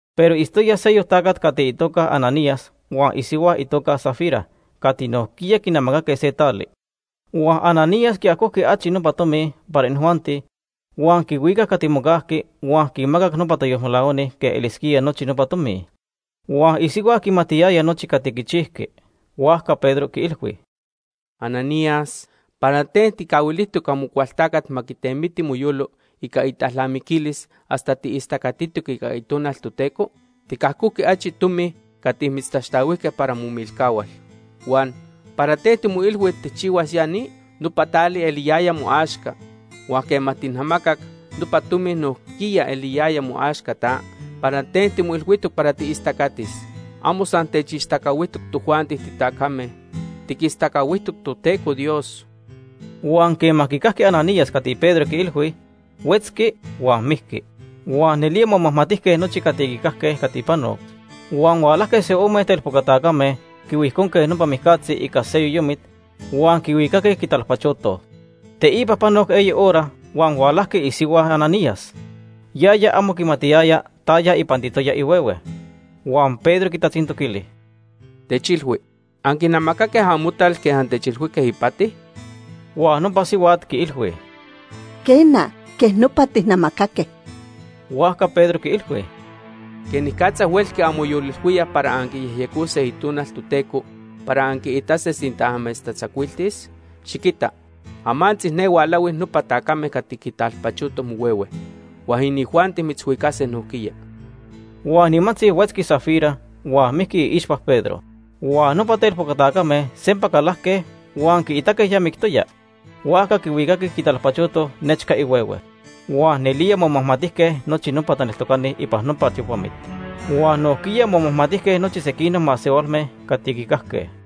Pero itztoya seyoc tacat cati itoca Ananías huan isihua itoca Safira cati nojquiya quinamacaque se tali. Huan Ananías quiajojqui achi nopa tomi para inijuanti, huan quihuicac cati mocajqui huan quinmacac nopa tayolmelahuani quej elisquía nochi nopa tomi. Huan isihua quimatiyaya nochi cati quichijqui. Huajca Pedro quiilhui: ―Ananías, ¿para ten tijcahuilijtoc Amocualtacat ma quitemiti moyolo ica italnamiquilis hasta tiistacatitoc ica Itonal Toteco? Ticajojqui achi tomi cati mitztaxtahuijque para momilcahual. Huan ¿para ten timoilhui tijchihuas ya ni? Nopa tali eliyaya moaxca. Huan quema tijnamacac, nopa tomi nojquiya eliyaya moaxca ta. ¿Para ten timoilhuijtoc para tiistacatis? Amo san techistacahuijtoc tojuanti titacame, tiquistacahuijtoc Toteco Dios. Huan quema quicajqui Ananías cati Pedro quiilhui, huetzqui huan mijqui. Huan nelía momajmatijque nochi cati quicajque cati pano. Huan hualajque se ome telpoca tacame, quihuijconque nopa mijcatzi ica se yoyomit, huan quihuicaque, quitalpachotoj. Teipa panoc eyi hora huan hualajqui isihua Ananías. Yaya amo quimatiyaya taya ipantitoya ihuehue. Huan Pedro quitatzintoquili: ―Techilhui, ¿anquinamacaque amotal quej antechilhuijque ipati? Huan nopa sihuat quiilhui: ―Quena, quej nopa tijnamacaque. Huajca Pedro quiilhui: ―¿Quenicatza huelqui anmoyolilhuíaj para anquiyejyecose Itonal Toteco para anquiitase sinta amechtatzacuiltis? Xiquita, amantzi ne hualahui nopa tacame cati quitalpachotoj mohuehue. Huan inijuanti mitzhuicase nojquiya. Huan nimantzi, huetzqui Safira huan mijqui iixpa Pedro. Huan nopa telpoca tacame sempa calajque huan quiitaque ya mictoya, huajca quihuicaque quitalpachotoj nechca ihuehue. Huan nelía momajmatijque nochi nopa taneltocani ipan nopa tiopamit. Huan nojquiya momajmatijque nochi sequinoc masehualme cati quicajque.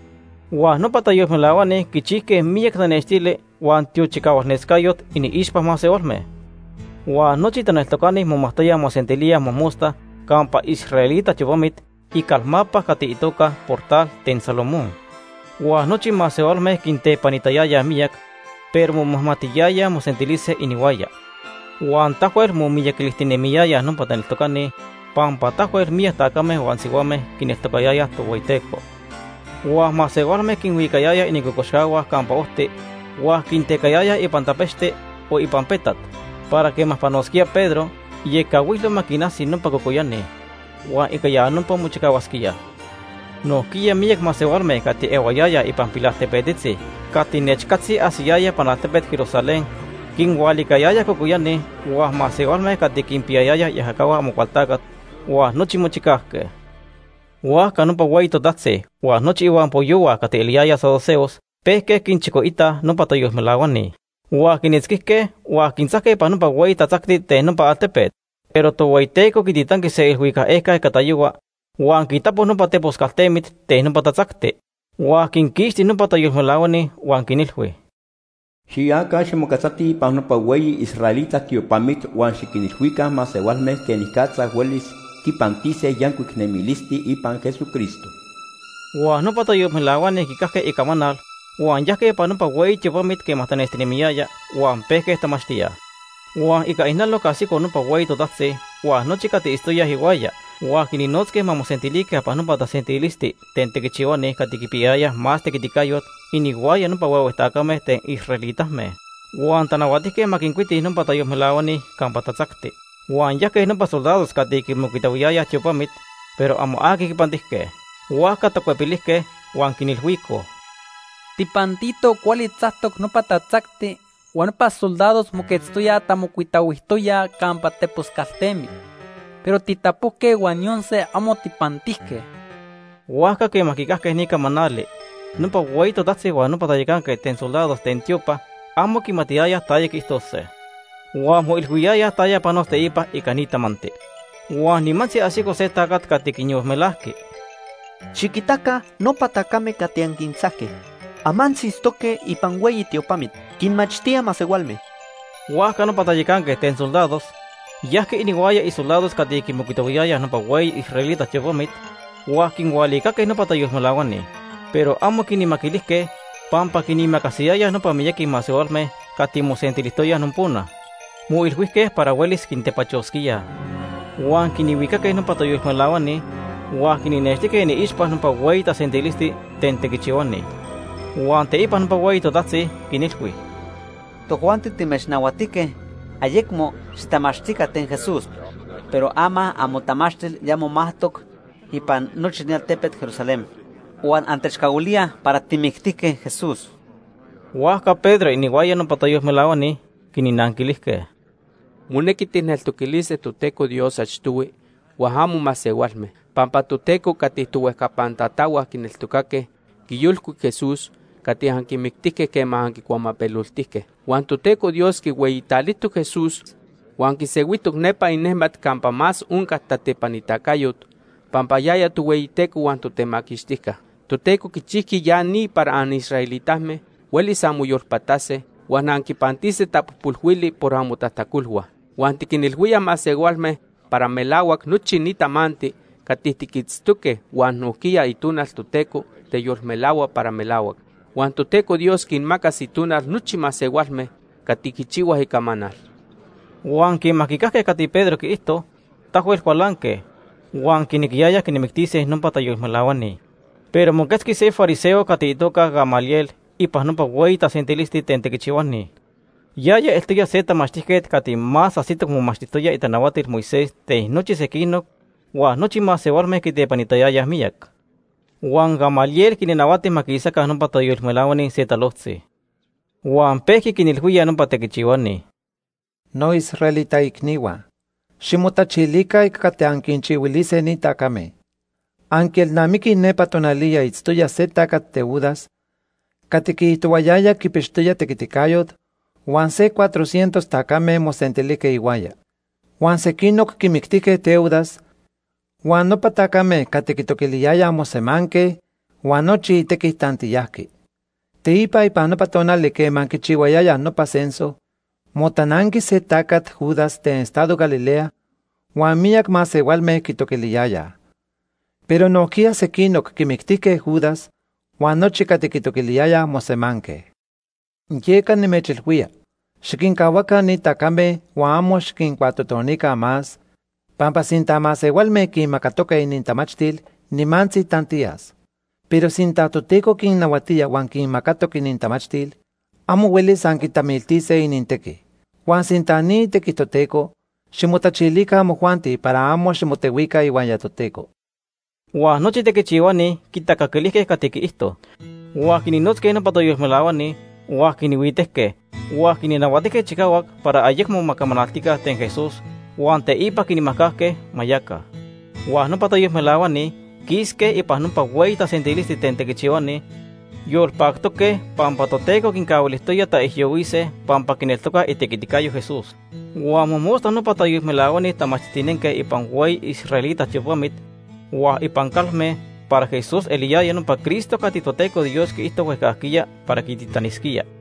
Huan nopa tayolmelahuani quichijque miyac tanextili huan tiochicahualnescayot iniixpa masehualme. Huan nochi taneltocani momajtoyaj mosentilíaj mojmosta campa israelita tiopamit icalmapa cati itoca Portal ten Salomón. Huan nochi masehualme quintepanitayayaj miyac, pero momajmatiyayaj mosentilise inihuaya. Huan tahuel momiyaquilijtinemiyayaj nopa taneltocani pampa tahuel miyac tacame huan sihuame quineltocayayaj Tohueyiteco. Huan masehualme quinhuicayayaj inincocoxcahua campa ojti huan quintecayayaj ipan tapechti o ipan petat para quema panosquía Pedro, iecahuilo ma quinajsi nopa cocoyani. Huan ica ya nopa mochicahuasquíaj. Nojquiya miyac masehualme cati ehuayayaj ipan pilaltepetzitzi cati nechcatzi ajsiyayaj ipan altepet Jerusalén, quinhualicayayaj cocoyani, huan masehualme cati quinpiyayayaj iajacahua Amocualtacat huan nochi mochicajque. Huajca nopa hueyi totajtzi huan nochi ihuampoyohua cati eliyayaj saduceos pejque quinchicoitaj nopa tayolmelahuani. Huan quinitzquijque huan quintzajque ipan nopa hueyi tatzacti ten nopa altepet. Pero Tohueyiteco quititanqui se iilhuicac ejca ica tayohua huan quitapo nopa tepos caltemit ten nopa tatzacti. Huan quinquixti nopa tayolmelahuani huan quinilhui: “Xiyaca ximoquetzatij ipan nopa hueyi israelita tiopamit huan xiquinilhuica masehualme quenicatza huelis quipantise yancuic nemilisti ipan Jesucristo.” Huan nopa tayolmelahuani quicajque icamanal huan yajque ipan nopa hueyi tiopamit quema tanestihualayaya, huan pejque tamachtíaj. Huan ica ijnaloc ajsico nopa hueyi totajtzi huan nochi cati itztoyaj ihuaya, huan quinnotzque ma mosentilica ipan nopa tasentilisti ten tequichihuani cati quipiyayayaj más tequiticayot inihuaya nopa huehue tacame ten israelitame. Huan tanahuatijque ma quincuitij nopa tayolmelahuani campa tatzacti. Huan yajque nopa soldados cati quimocuitahuiyayaj tiopamit, pero amo aqui quipantijque. Huajca tacuepilijque, huan quinilhuicoj: ―Tijpantitoj cuali tzactoc nopa tatzacti, huan nopa soldados moquetztoyaj tamocuitahuijtoyaj campa tepos caltemit, pero tijtapojque huan yon se amo tijpantijque. Huajca quema quicajque ni camanali, nopa hueyi totajtzi huan nopa tayacanquet ten soldados ten tiopa amo quimatiyayaj taya quiijtose. Huan moyolilhuiyayaj taya panos teipa ica ni tamanti. Huan nimantzi ajsico se tacat cati quinyolmelajqui: ―Xiquitaca nopa tacame cati anquintzajque, amantzi itztoque ipan hueyi tiopamit, quinmachtíaj masehualme. Huajca nopa tayacanquet ten soldados yajqui inihuaya isoldados cati quimocuitahuiyayaj nopa hueyi israelita tiopamit huan quinhualicaque nopa tayolmelahuani. Pero amo quinmaquilijque pampa quinimacasiyayaj nopa miyaqui masehualme cati mosentilijtoyaj nopona. Moilhuijque para huelis quintepachosquíaj. Huan quinhuicaque nopa tayolmelahuani huan quinnextijque iniixpa nopa hueyi tasentilisti ten tequichihuani. Huan teipa nopa hueyi totajtzi quinilhui: ―Tojuanti timechnahuatijque ayecmo xitamachtica ten Jesús. Pero ama amotamachtil ya momajtoc ipan nochi ni altepet Jerusalén. Huan antechcahuilíaj para tijmictijque Jesús. Huajca Pedro inihuaya nopa tayolmelahuani quinnanquilijque: ―Monequi tijneltoquilise Toteco Dios achtohui huan amo masehualme. Pampa Toteco cati tohuejcapan tatahua quineltocaque quiyolcuic Jesús cati anquimictijque quema anquicuamapeloltijque. Huan Toteco Dios quihueyitalijtoc Jesús huan quisehuijtoc nepa inejmat campa más onca tatepanitacayot pampa yaya Tohueyiteco huan Totemaquixtijca. Toteco quichijqui ya ni para anisraelitame huelis anmoyolpatase huan anquipantise tapojpolhuili por amotajtacolhua. Huan tiquinilhuíaj masehualme para melahuac nochi ni tamanti cati tiquitztoque huan nojquiya Itonal Toteco teyolmelahua para melahuac. Huan Toteco Dios quinmacas Itonal nochi masehualme cati quichihuaj icamanal. Huan quema quicajque cati Pedro quiijto, tahuel cualanque, huan quinequiyayaj quinmictise nopa tayolmelahuani. Pero moquetzqui se fariseo cati itoca Gamaliel ipan nopa hueyi tasentilisti ten tequichihuani. Yaya eltoya se tamachtijquet cati más ajsitoc momachtijtoya itanahuatilhua Moisés ten nochi sequinoc huan nochi masehualme quitepanitayayaj miyac. Huan Gamaliel quinnahuati ma quisaca nopa tayolmelahuani se talojtzi, huan pejqui quinilhuía nopa tequichihuani: ―Noisraelita icnihua, ximotachilica ica cati anquinchihuilise ni tacame. Anquielnamiquij nepa tonaliya itztoya se tacat Teudas cati quiijtohuayaya quipixtoya tequiticayot, huan se cuatrocientos tacame mosentilijque ihuaya. Huan sequinoc quimictijque Teudas, huan nopa tacame cati quitoquiliyayaj mosemanque, huan nochi itequi tantiyajqui. Teipa ipan nopa tonali quema quichihuayayaj nopa censo, motananqui se tacat Judas ten estado Galilea, huan miyac masehualme quitoquiliyayaj. Pero nojquiya sequinoc quimictijque Judas, huan nochi cati quitoquiliyayaj mosemanque. Yeca nimechilhuía, xiquincahuaca ni tacame huan amo xiquincuatotonica más, pampa sinta masehualme quinmacatoque inintamachtil, nimantzi tantiyas. Pero sinta Toteco quinnahuatía huan quinmacatoc inintamachtil, amo huelis anquitamiltise inintequi. Huan sinta ni itequi Toteco, ximotachilica amojuanti para amo ximotehuica ihuaya Toteco. Huan nochi tequichihuani quitacaquilijque cati quiijto. Huan quinnotzque nopa tayolmelahuani huan quinhuitejque, huan quinnahuatijque chicahuac para ma ayecmo más camanaltica ten Jesús, huan teipa quinmajcajque ma yaca. Huan nopa tayolmelahuani quisque ipan nopa hueyi tasentilisti ten tequichihuani yolpactoque pampa Toteco quincahuilijtoya taijyohuise pampa quineltocaj itequiticayo Jesús. Huan mojmosta nopa tayolmelahuani tamachtijtinenque ipan hueyi israelita tiopamit huan ipan calme para Jesús eliyaya nopa Cristo cati Toteco Dios quiijto huejcajquiya para quititanisquía.